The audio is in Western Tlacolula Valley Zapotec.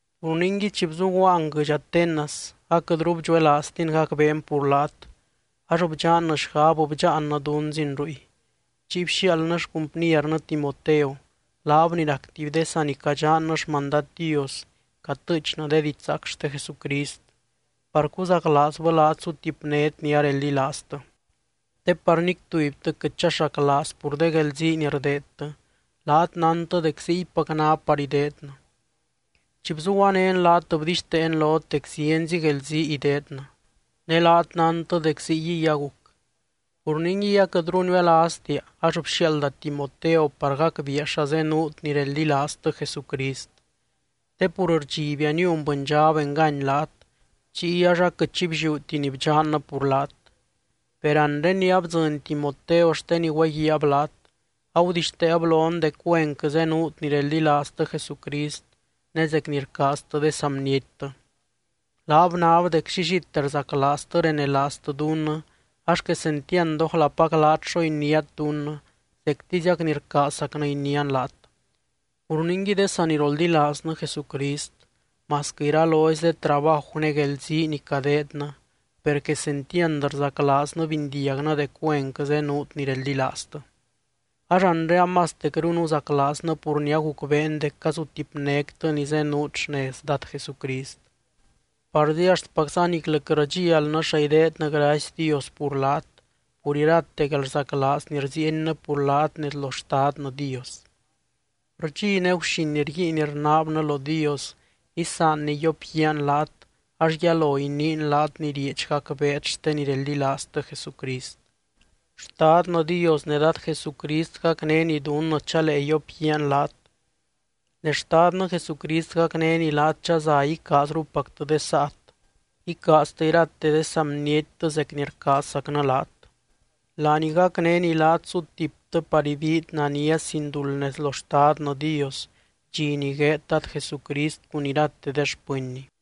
Pur ningui chi bzuguaan guɨdx Atenas aquɨtru bdxuelaaztin gacbeen pur laat, ax bdxannɨ xgab bdxaannɨ dunzin ruy. Chiy bxiaaldnɨ xcumpniernɨ Timoteo, laab ni rac tuby de sanicadxannɨ xmandad Dios catɨɨchnɨ de didxzaac xte Jesucrist, par cuzaclaazbɨ laat sutipnét ni areldilaaztɨ. Te par nic tubytɨ quɨt chaxaclaaz pur de guelzii ni rdeedtɨ, laat nántɨ dec ziypac ná par ideednɨ. Chi bzuguanén laat bdixteen lot dec zienzi guelzii ideednɨ, ne laat nántɨ dec ziyguiy aguc. Pur ningui aquɨtru niuelaaztia, ax bxiaalda Timoteo par gacbiia xa zenuut ni reldilaaztɨ Jesucrist. Te pur rdxibia niun bɨndxab engany laat, chiy ax aquɨt xi blliúti ni bdxannɨ pur laat. Per anre ni abdzɨny Timoteo xte ni güeguiaab laat, agudixteeb lon dec güenquɨ zenuut ni reldilaaztɨ Jesucrist ne zec ni rcaaztɨ de saa bniettɨ. Laab nab dec llillite rzaclaaztɨ renelaaztɨ dunnɨ ax quesentiand ójlapac laat xo iniát dunnɨ, zectiziac ni rcaazzacnɨ inián laat. Pur ningui, de saniroldilaaznɨ Jesucrist, masquɨ iralozy de trabaju ne guelzii ni cadeednɨ, per quesentiand rzaclaaznɨ bindiagnɨ dec güenquɨ zenuut ni reldilaaztɨ. Ax anre amastecru nuzaclaaznɨ pur ni agucbeen dec cazutipnéctɨ ni zenuut xnez Dad Jesucrist. Parzi axtpacza niclɨ quɨt rdxialnɨ xa ideednɨ gracy Dios pur laat, pur irate guelrzaclaaz ni rziiennɨ pur laat nez lo Xtadnɨ Dios. Rdxi ne guxin rguiin rnaabnɨ lo Dios isaanny yiopguiaan laat, ax yalo iniin laat ni rieedx gacbeet xte ni reldilaaztɨ Jesucrist. Xtadnɨ Dios ne Dad Jesucrist gacnény dunnɨ chalee yiopguiaan laat. Ne Xtadnɨ Jesucrist gacnény laat chaza icaazrupactɨ de saat, icaaztɨ irate de saa bniettɨ zec ni rcaazzacnɨ laat. Laany gacnény laat sutiptɨ par ibiit nania, sin duld nez lo Xtadnɨ Dios, dxi ni gueed Dad Jesucrist cun irate de xpɨnny.